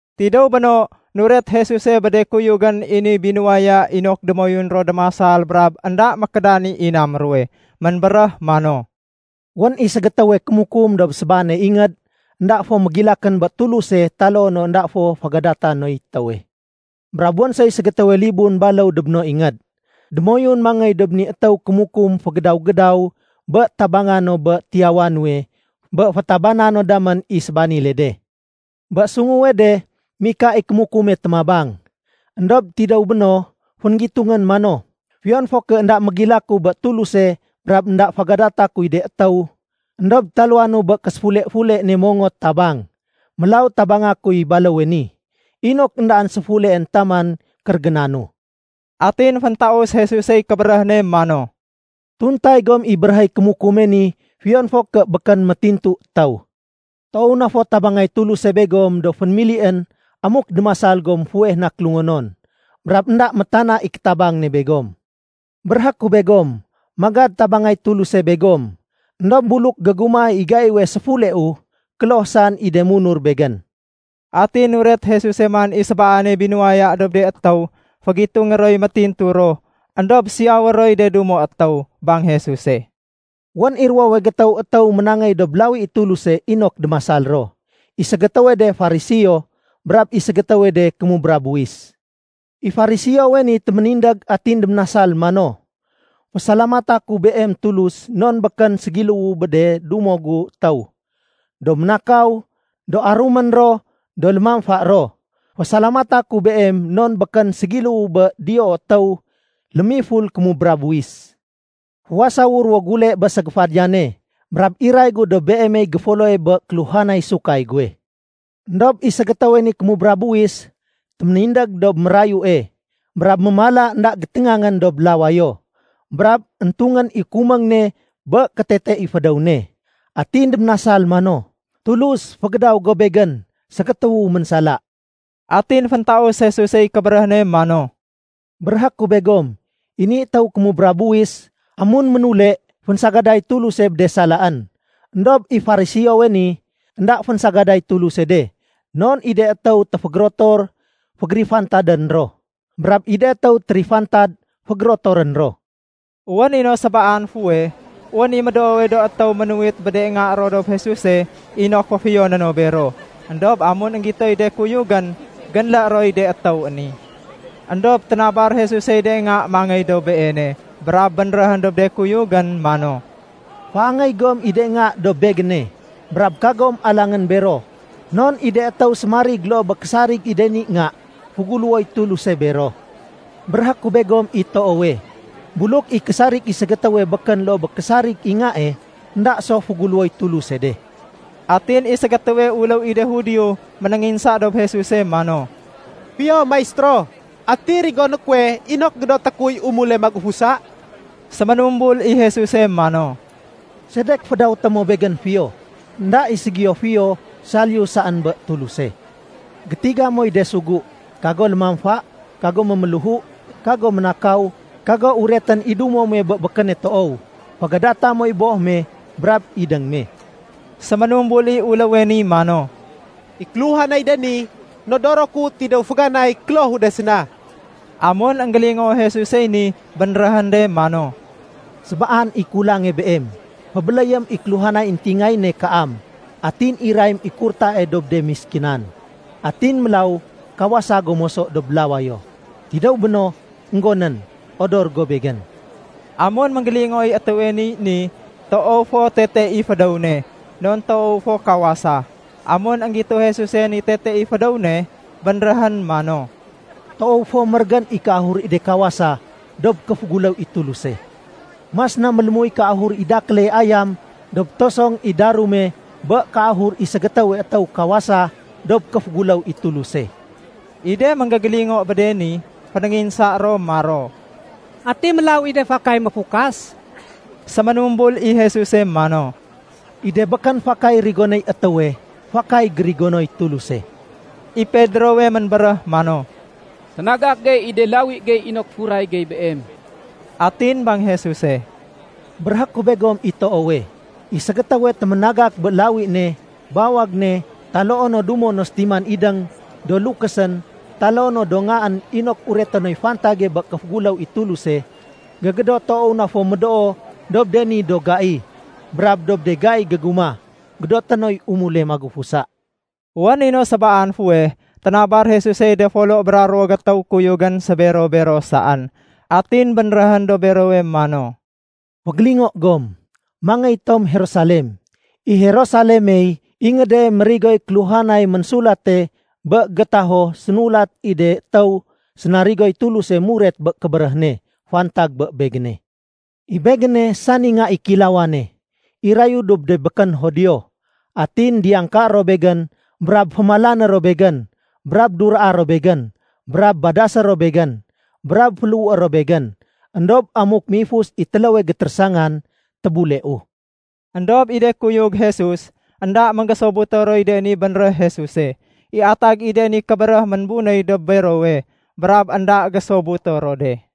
Tidéw béno, nuret Jesuse bé de kuyugén i ni binuwaya inok démoyun ro démasal brab énda mékédan i inam ruwe. Ménbéréh mano, “Wén i ségétéwe kémukum dob sébaane ingéd, énda fo mégilakén bé Tuluse taloo no énda fo fégadata noy étéwe. Brab wén soy ségétéwe libun baléw dob no ingéd. Démoyun mangéy dob ni étéw kémukum fégédaw-gédaw bé tabanga no bé tiyawa nuwe bé fétabana no damén i sébanile de. Bé sunguwe de, mika i kémukume témabang. Endob tidéw béno, fénggitungén mano, ‘Fiyon fo ké énda mégilaku bé Tuluse brab énda fégadata kuy de étéw, éndob taluwanu bé késéfule-fule ne mongot tabang. Mélaw tabanga kuy baléwe ni, inok éndaén séfuleén taman kérégénanu.’” Atin féntaus Jesusey kébéréh ne mano, “Tuntay gom i béréhéy kémukume ni fiyon fo ké békén métintu étéw. Toow na fo tabangay Tuluse begom do fénémilién amuk démasal gom fuweh na kélungonon. Brab énda métana i kétabang ne begom. Béréhé ku begom, magad tabangay Tuluse begom. Endob buluk gégumah i gaiwe séfuleu, kloh saén i de munur Begén.” Atin nuret Jesuse man i sébaane binuwaya dob de étéw fégitungé roy métintu ro éndob siyawé roy de dumo étéw. Bang Jesuse, “Wén i ruwowe gétéw étéw ménangéy dob lawi i Tuluse inok démasal ro. I ségétéwe de Fariseo brab i ségétéwe de kémubra buwis. I Fariseowe ni téménindég atin déménasal mano, ‘Fésalamata ku Beem Tulus non békén ségiléwu bé de dumo gu étéw, do ménakaw, do arumén ro, do lémamfa ro. Fésalamata ku Beem non békén ségiléwu bé diyoo étéw lémiful kémubra buwis. Fuwasawu ruwo gule bé ségéfadiyane, brab iray gu dob Beemey géfoloe bé kéluhanay sahudé kuwe.’ Endob i ségétéwe ni kémubra buwis téménindég dob mérayue, brab mémala énda géténgangén dob lawayo, brab éntungén i kuméng ne bé kétete i fédéw ne. Atin déménasal mano, ‘Tulus, fégédaw go begén ségétéwu ménsala.’” Atin féntaus Jesusey kébéréh ne mano, “Béréhé ku begom, i ni étéw kémubra buwis, amun ménule, fénsagaday Tuluse bé de salaén. Endob i Fariseowe ni, énda fénsagaday Tuluse de. Non i de étéw téfégérotor, fégérifantadén ro. Brab i de étéw térifantad, fégérotorén ro.” Wén i no sébaan fuweh, wén i médoowe do étéw ménuwit bé de nga ro dob Jesuse inok féfiyoné no bero. Endob amun énggitoy de kuyugén, génlé roy de étéw ni. Endob ténabar Jesusey de nga mangéy dob Beene, brab bénréhén dob de kuyugén mano, “Féangéy gom i de nga dob Begéne. Brab kagom alangén bero non i de étéw sémarig loo bé késarig i de ni nga, féguléwoy Tuluse bero. Béréhé ku begom i toowe, buluk i késarig i ségétéwe békén loo bé késarig i ngae, énda so féguléwoy Tuluse de.” Atin i ségétéwe uléw i de Judio ménénginsa dob Jesuse mano, “Fiyo maistéro, ati rigoné kuwe inok gédoté kuy umule magufusa?” Séménumbul i Jesuse mano, “Sedek fédawété mo Begén fiyo? Enda i ségiyo fiyo saliyu saén bé Tuluse. Gétiga moy de sugu. Kago lémamfa, kago méméléhu, kago ménakaw, kago uretén i dumo muwe bé békéne toow, fégadata moy boh me brab idéng me.” Séménumbul i uléwe ni mano, “I kéluhanay de ni, nodoro ku tidéw féganay klohu de séna.” Amun énggélingoo Jesusey ni, bénréhén de mano, “Sébaan i kulange beem. Fébéléyém i kéluhanay éntingayéne kaam atin irayém i kurtae dob de méskinan. Atin mélaw kawasa go moso dob lawayo. Tidéw béno, énggonén, odor go Begén.” Amun énggélingooy étéwe niy ni, toow fo tete i fédéw ne, non toow fo kawasa. Amun énggito Jesuse ni tete i fédéw ne, bénréhén mano, “Toow fo mérégén i kéahur i de kawasa dob kéféguléw i Tuluse. Mas na mélémuy kéahur i dakéle ayam dob tosong i darume bé kéahur i ségétéwe étéw kawasa dob kéféguléw i Tuluse.” I de énggégélingo bé de ni, fénénginsa ro maro, “Ati mélaw i de fakay méfukas?” Séménumbul i Jesuse mano, “I de békén fakay rigonéy étéwe, fakay gérigonoy Tuluse.” I Pedrowe ménbéréh mano, “Ténagak gey i de lawi gey inok furay gey Beem.” Atin bang Jesuse, “Béréhé ku begom i toowe, i ségétéwe téménagak bé lawi ne, bawag ne, taloo no dumo no sétiman idéng, do lukésén, taloo no do ngaén inok ureté noy fantag bé kéféguléw i Tuluse, gégédot toow na fo médoo dob de ni do gai. Brab dob de gai gégumah, gédoté noy umule magufusa.” Wén i no sébaan fuweh, ténabar Jesusey de folo bra ruwo gétéw kuyugén sébero-bero saén, atin bénréhén dob berowe mano, “Fégélingo gom, mangéy tom Jerusalem. I Jerusalemey ingéde mérigoy kéluhanay ménsulate bé gétaho sénulat i de étéw sénarigoy Tuluse muret bé kébéréh ne fantag bé Begéne. I Begéne sani Nga i Kéilawane, irayu dob de békén Judio. Atin diyangkaé ro Begén brab fémalané ro Begén, brab duraa ro Begén, brab badasé ro Begén, brab féléhué ro Begén. Endob amuk méifus i téléwe gétérésangan, tébuleu.” Endob i de kuyug Jesus, énda énggésobuto roy de ni bénréh Jesuse. I atag i de ni kébéréh ménbunéy dob berowe, brab énda gésobuto ro de.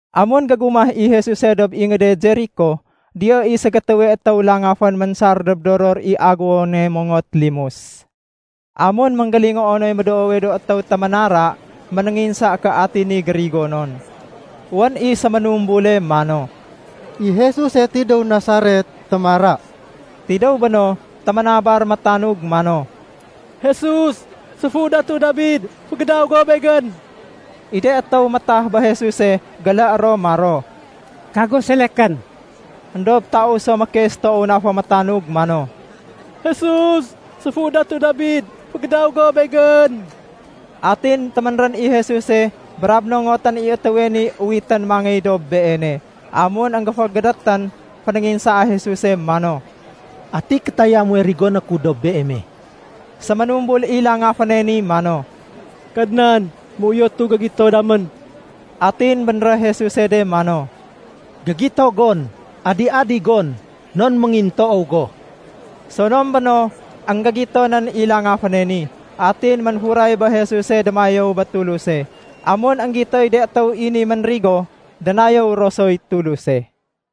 Amun gégumah i Jesuse dob ingéde Jeriko, diyo i ségétéwe étéw langafén ménsar dob doror i aguwone mongot limus. Amun énggélingoo noy médoowe do étéw téménara, ménénginsa ké ati ni gérigonon. Wén i séménumbule mano, “I Jesuse tidéw Nasaret témara.” Tidéw béno, téménabar métanug mano, “Jesus, séfu Datu Dabid, fégédaw go begén!” I de étéw métah bé Jesuse géléé ro maro, “Kago selekén!” Endob taus so mékes toow na fo métanug mano, “Jesus, séfu Datu Dabid, fégédaw go begén!” Atin téménrén i Jesuse brab nongotén i étéwe ni uwitén mangéy dob Beene. Amun énggéfégédétén, fénénginsaa Jesuse mano, “Ati kétaya muwe rigoné ku dob beeme.” Séménumbul i langaféne ni mano, “Kadnan, méuyotu gégito damén.” Atin bénréh Jesuse de mano, “Gégito gon. Adi-adi gon, non méngintoow go.” Sonom béno, énggégito nén i langaféne ni, atin ménfuray bé Jesuse démayéw bé Tuluse. Amun énggitoy de étéw i ni ménrigo, dénayéw ro soy Tuluse.